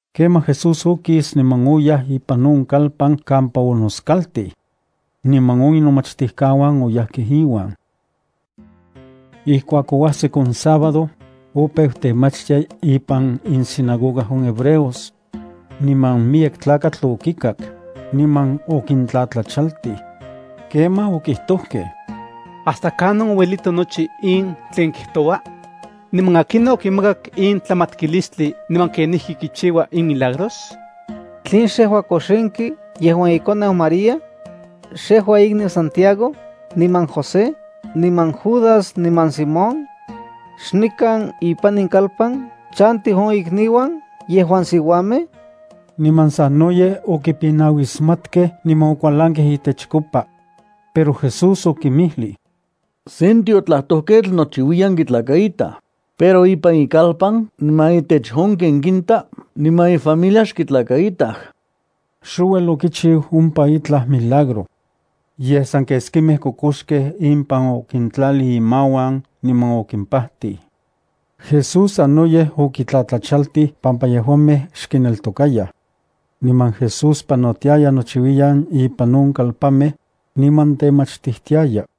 Kemaj Jesús okis niman oyaj ipan on kalpan kampa onoskaltij. Niman on inomachtijkauan oyajkej iuan. Ijkuak oajsik on sábado, opeu temachtia ipan insinagoga on hebreos. Niman miyek tlakatl okikak, niman okintlatlachaltij. Kemaj okijtojkej: —¿Hasta kanon ouelito nochi in tlen kijtoua?, niman ¿akinon okimakak in tlamatkilistli niman kenijki kichiua in milagros? ¿Tlen xejua kojxinki yejuan ikoneu María? ¿Xejua ikniu Santiago, niman José, niman Judas niman Simón? ¿Xnikan ipan in kalpan chantij on ikniuan yejuan siuamej? Niman sanoyej okipinauismatkej niman okualankej itechkopa. Pero Jesús okinmijlij: —Sen tiotlajtojketl nochiuiyan kitlakaitaj, pero ipan ikalpan niman intech on ken kinta niman ifamilia xkitlakaitaj. Xouel okichiu ompa itlaj milagro. Yej san keskimej kokoxkej impan okintlalij imauan, niman okimpajtij. Jesús sanoyej okitlatlachaltij pampa yejuamej xkineltokayaj. Niman Jesús panotiaya nochiuiyan ipan on kalpanmej, niman temachtijtiaya.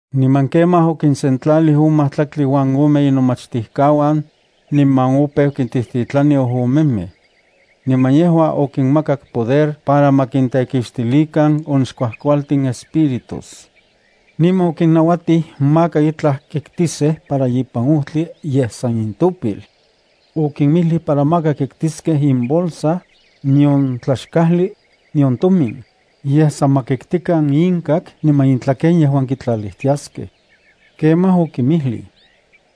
Niman kemaj okinsentlalij on majtlaktli uan ome inomachtijkauan, niman opeu kintijtitlani ojomemej. Niman yejua okinmakak poder para ma kintekixtilikan on xkuajkualtin espíritus. Niman okinnauatij maka itlaj kitkiskej para ipan ojtli yej san intopil. Okimijlij para maka kitkiskej imbolsa, nion tlaxkajli, nion tomin, yej san ma kiktikan inkak niman intlaken yejuan kitlalijtiaskej. Kemaj okinmijlij: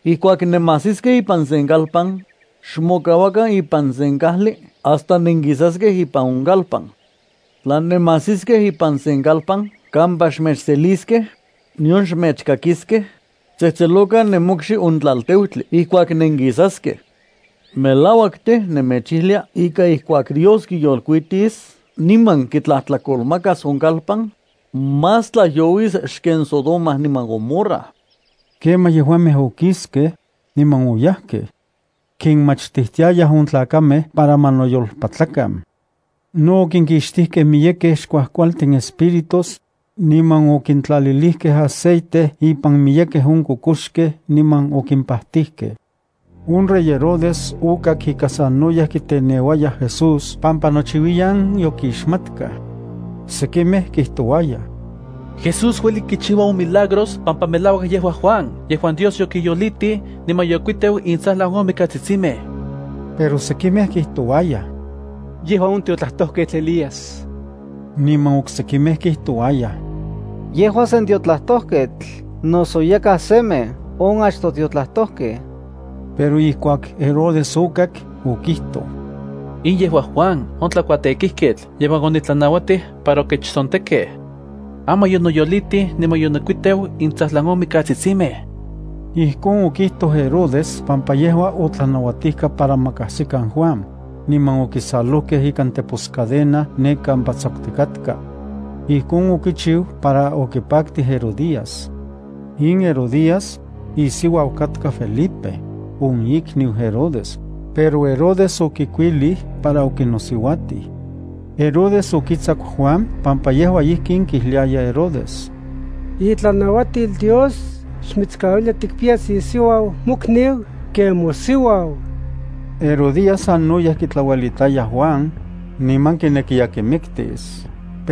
—Ijkuak nenmajsiskej ipan sen kalpan, xmokauakan ipan sen kajli hasta nenkisaskej ipan on kalpan. Tla nenmajsiskej ipan sen kalpan kampa xmechseliskej, nion mechkakiskej, xtsejtselokan nemokxi on tlalteutli ijkuak nenkisaskej. Melauak tej, nemechijlia ika ijkuak Dios kiyolkuitis niman kitlajtlakolmakas on kalpan, más tlajyouis xken Sodoma niman Gomorra. Kemaj yejuamej okiskej, niman oyajkej. Kinmachtijtiayaj on tlakamej para ma noyolpatlakan. No okinkixtijkej miyekej xkuajkualtin espíritus, niman okintlalilijkej aceite ipan miyekej on kokoxkej, niman okimpatijkej. On rey Herodes okak ika sanoyej kiteneuayaj Jesús pampa itoka nochiuiyan yokixmatkaj. Sekimej kijtouayaj: —Jesús ueli kichiua on milagros pampa melauak yejua Juan yejuan Dios yokiyolitij niman yokuiteu intsajlan on mikatsitsimej. Pero sekimej kijtouayaj: —Yejua on tiotlajtojketl Elías. Niman oksekimej kijtouayaj: —Yejua sen tiotlajtojketl noso yakaj semej on achtoj tiotlajtojkej. Pero ijkuak Herodes okak, okijtoj: —In yejua Juan on tlakuatekijketl yejuan onitlanauatij para okechtsontekkej. Aman yonoyolitij niman yonokuiteu intsajlan on mikatsitsimej. Ijkon okijtoj Herodes pampa yejua otlanauatijka para ma kajsikan Juan, niman okisalojkej ikan teposcadena ne kampa tsakutikatka. Ijkon okichiu para okipaktij Herodías. In Herodías, isiuau katka Felipe on ikniu Herodes, pero Herodes okikuilij para okinosiuatij. Herodes okitsaku Juan pampa yejua kijliaya Herodes: —Itlanauatil Dios xmitskauilia tikpiyas isiuau mokniu ken mosiuau. Herodías sanoyej kitlauelitaya Juan, niman kinekiya kimiktis,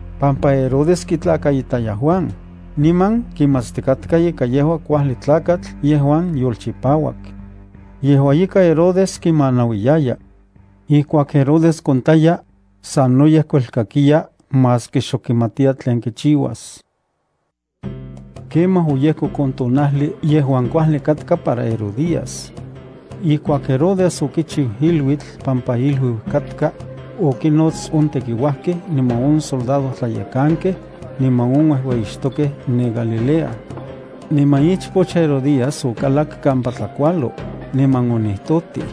pampa Herodes kitlakaitaya Juan, niman kimatstikatka ika yejua kuajli tlakatl yejuan yolchipauak. Yejua ika, Herodes kimanauiyaya. Ijkuak Herodes kontaya, sanoyej kuelkakiya maski xok kimatiya tlen kichiuas. Kemaj oyejkok on tonajli yejuan kuajli katka para Herodías. Ijkuak Herodes okichiu iluitl pampa iluiu katka, okinnots on tekiuajkej, niman on soldadojtlayekankej niman on uejueyixtokej ne Galilea. Niman ichpoch Herodías okalak kampa tlakualo, niman onijtotij.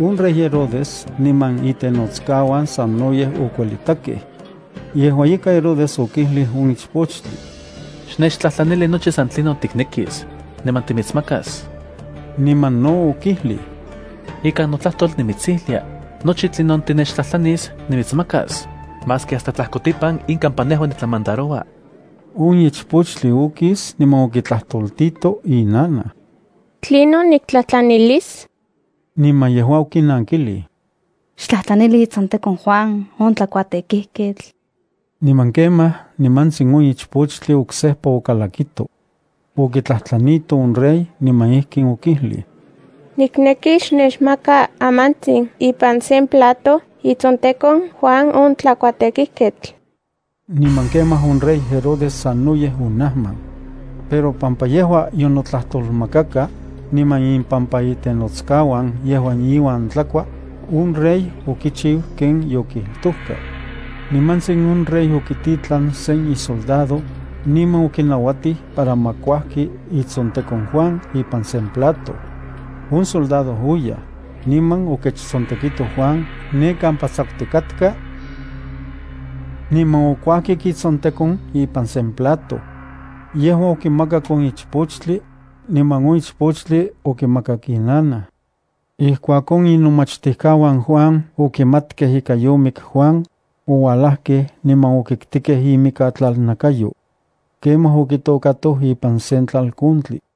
On rey Herodes niman itenotskauan sanoyej okuelitakej. Yejua ika Herodes okijlij on ichpochtli: —Xnechtlajtlanili nochi san tlinon tiknekis, niman nimitsmakas. Niman no okijlij: —Ikan notlajtol nimitsijlia: “Nochi tlinon tinechtlajtlanis nimitsmakas, maski hasta tlajkotipan in kampa nejua nitlamandaroua.” On ichpochtli okis niman okitlajtoltito inanaj. —¿Tlinon niktlajtlanilis? Niman yejua okinankijlij: —Xtlajtlanili itsontekon Juan on tlakuatekijketl. Niman kemaj nimantsin on ichpochtli oksejpa okalakito. Okitlajtlanito on rey niman ijkin okijlij: —Nikneki xnechmaka amantsin ipan sen plato itsontekon Juan on tlakuatekijketl. Niman kemaj on rey Herodes sanoyej onajman. Pero pampa yejua yonotlajtolmakaka, niman impampa itenotskauan yejuan inuan tlakua, on rey okichiu ken yokijtojka. Nimantsin on rey okititlan sen isoldado, niman okinauatij para ma kuajki itsontekon Juan ipan sen plato. On soldado oyaj, niman okechtsontekito Juan ne kampa tsakutikatka, niman okuajkik itsontekon ipan sen plato. Yejua okimakak on ichpochtli, niman on ichpochtli okimakak inanaj. Ijkuak on inomachtijkauan Juan okimatkej ika yomik Juan, oualajkej niman okiktikej imikatlalnakayo. Kemaj okitokatoj ipan sen tlalkontli.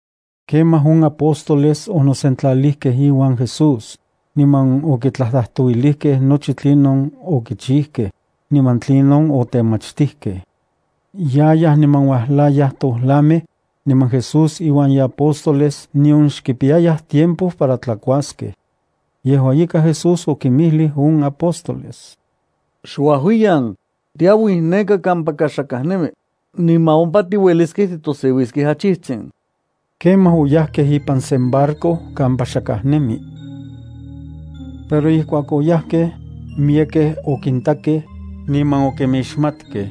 Kemaj on apóstoles onosentlalijkej iuan Jesús, niman okitlajtlajtouilijkej nochi tlinon okichijkej, niman tlinon otemachtijkej. Yayaj niman uajlayaj tojlamej, niman Jesús iuan iapóstoles nion xkipiyayaj tiempo para tlakuaskej. Yejua ika, Jesús okinmijlij on apóstoles: —Xuajuiyan, tiauij neka kampaka xakaj nemi, niman ompa tiueliskej titoseuiskej achijtsin. Kemaj oyajkej ipan sen barco kampa xakaj nemi. Pero ijkuak oyajkej, miyekej okintakej, niman okinmixmatkej.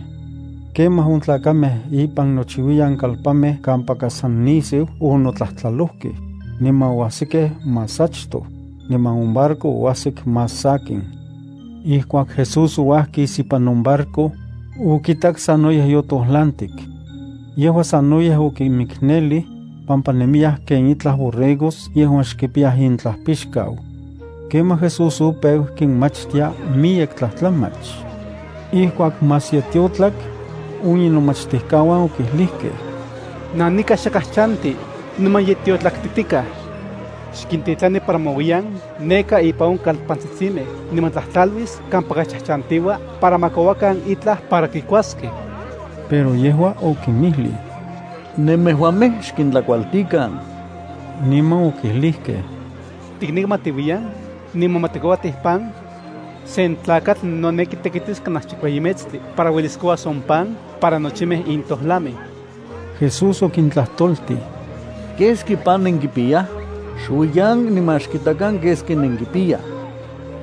Kemaj on tlakamej ipan nochiuiyan kalpanmej kampaka san nisiu onotlajtlalojkej, niman oajsikej más achtoj, niman on barco oajsik más sakin. Ijkuak Jesús ouajkis ipan on barco, okitak sanoyej yotojlantik. Yejua sanoyej okinmiknelij, pampa nemiyaj ken itlaj borregos yejuan xkipiyaj intlajpixkau. Kemaj Jesús opeu kinmachtia miyek tlajtlamach. Ijkuak más ye tiotlak, on inomachtijkauan okijlijkej: —Nanika xakaj chanti, niman ye tiotlaktitikaj. Xkintitlani para ma uiyan neka ipan on kalpantsitsimej niman tlatlaluis kampaka chajchantiua para ma kouakan itlaj para kikuaskej. Pero yejua okinmijlij: —Nemejuamej xkintlakualtikan. Niman okijlijkej: —¿Tikneki ma tiuiyan, niman ma tikouatij pan? Sen tlakatl noneki tekitis kanaj chikueyi metstli para uelis kouas on pan para nochimej in tojlamej. Jesús okintlajtoltij: —¿Keski pan nenkipiyaj? Xuiyan, niman xkitakan keski nenkipiyaj.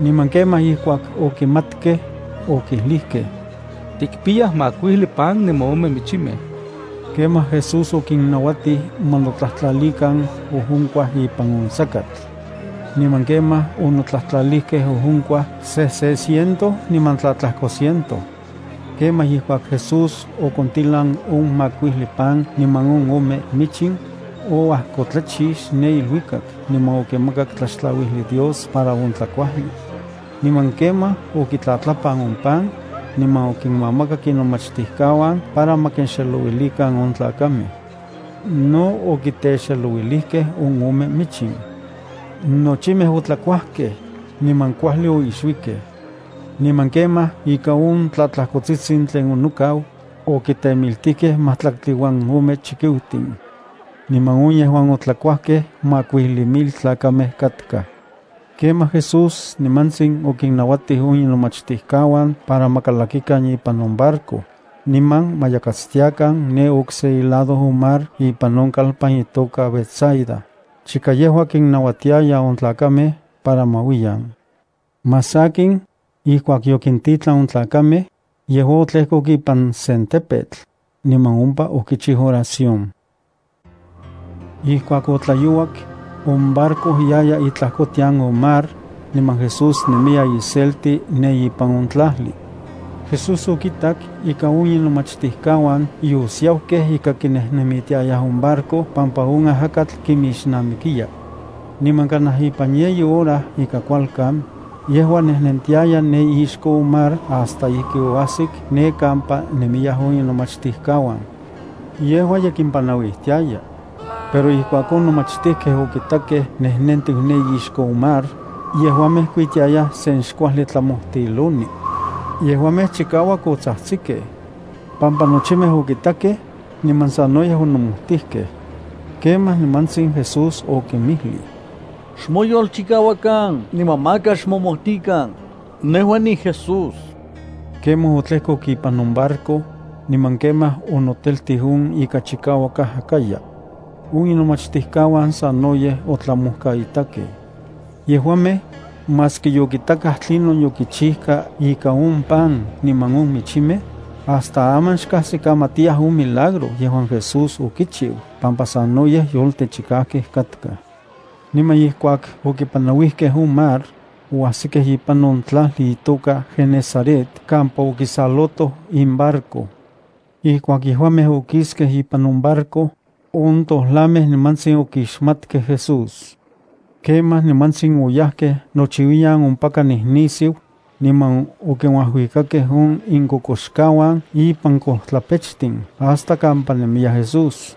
Niman kemaj ijkuak okimatkej, okijlijkej: —Tikpiyaj makuijli pan niman ome michimej. Kemaj Jesús okinnauatij ma notlajtlalikan ojonkua ipan on sakatl. Niman kemaj onotlajtlalijkej ojonkuaj sejse ciento niman tlatlajko ciento. Kemaj ijkuak Jesús okontilan on makuijli pan niman on ome michin, oajkotlachix ne iluikak niman okimakak tlaxtlauijli Dios para on tlakuajli. Niman kemaj okitlatlapan on pan, niman okinmakak inomachtijkauan para ma kinxelouilikan on tlakamej. No okitexelouilijkej on ome michin. Nochimej otlakuajkej, niman kuajli oixuikej. Niman kemaj ika on tlatlajkotsitsin tlen onokau, okitemiltijkej majtlaktli uan ome chikiutin. Niman on yejuan otlakuajkej makuijli mil tlakamej katkaj. Kemaj Jesús nimantsin okinnauatij on inomachtijkauan para ma kalakikan ipan on barco, niman ma yakatstiakan ne okse ilado on mar ipan on kalpan itoka Betsaida, chika yejua kinnauatiaya on tlakamej para ma uiyan. Más sakin, ijkuak yokintitlan on tlakamej, yejua otlejkok ipan sen tepetl, niman ompa okichiu oración. Ijkuak otlayouak, on barco yaya itlajkotian on mar, niman Jesús nemiya iselti ne ipan on tlajli. Jesús okitak ika on inomachtijkauan yosiaukej ika kinejnemitiayaj on barco pampa on ajakatl kimixnamikiya. Niman kanaj ipan yeyi hora ika kualkan, yejua nejnentiaya ne ixko on mar hasta ijki oajsik ne kampa nemiyaj on inomachtijkauan. Yejua ye kimpanauijtiaya. Pero ijkuak on nomachtijkej okitakej nejnentiu ne ixko on mar, yejuamej kuitiayaj se xkuajli tlamojtiloni. Yejuamej chikauak otsajtsikej, pampa nochimej okitakej, niman sanoyej onomojtijkej. Kemaj nimantsin Jesús okinmijlij: —¡Xmoyolchikauakan niman maka xmomojtikan! Nejua niJesús. Kemaj otlejkok ipan on barco, niman kemaj onoteltij on ika chikauak ajakaya. On inomachtijkauan sanoyej otlamojkaitakej. Yejuamej, maski yokitakaj tlinon yokichijka ikan on pan niman on michinmej, hasta aman xkajsikamatiyaj on milagro yejuan Jesús okichiu pampa sanoyej yoltechikajkej katkaj. Niman ijkuak okipanauijkej on mar, oajsikej ipan on tlajli itoka Genesaret kampa okisalotoj imbarco. Ijkuak yejuamej okiskej ipan on barco, on tojlamej nimantsin okixmatkej Jesús. Kemaj nimantsin oyajkej nochiuiyan ompaka nijnisiu, niman okinuajuikakej on inkokoxkauan ipan kojtlapechtin hasta kampa nemiya Jesús.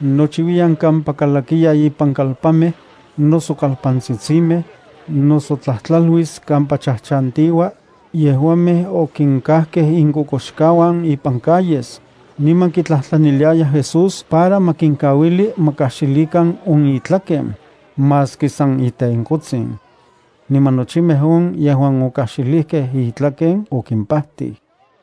Nochiuiyan kampa kalakiya ipan kalpanmej, noso kalpantsitsimej, noso tlajtlaluis kampa chajchantiua, yejuamej okinkajkej inkokoxkauan ipan calles, niman kitlajtlaniliayaj Jesús para ma kinokauili ma kajxilikan on itlaken, maski san itenkotsin. Niman nochimej on yejuan okajxilijkej itlaken okimpajtij.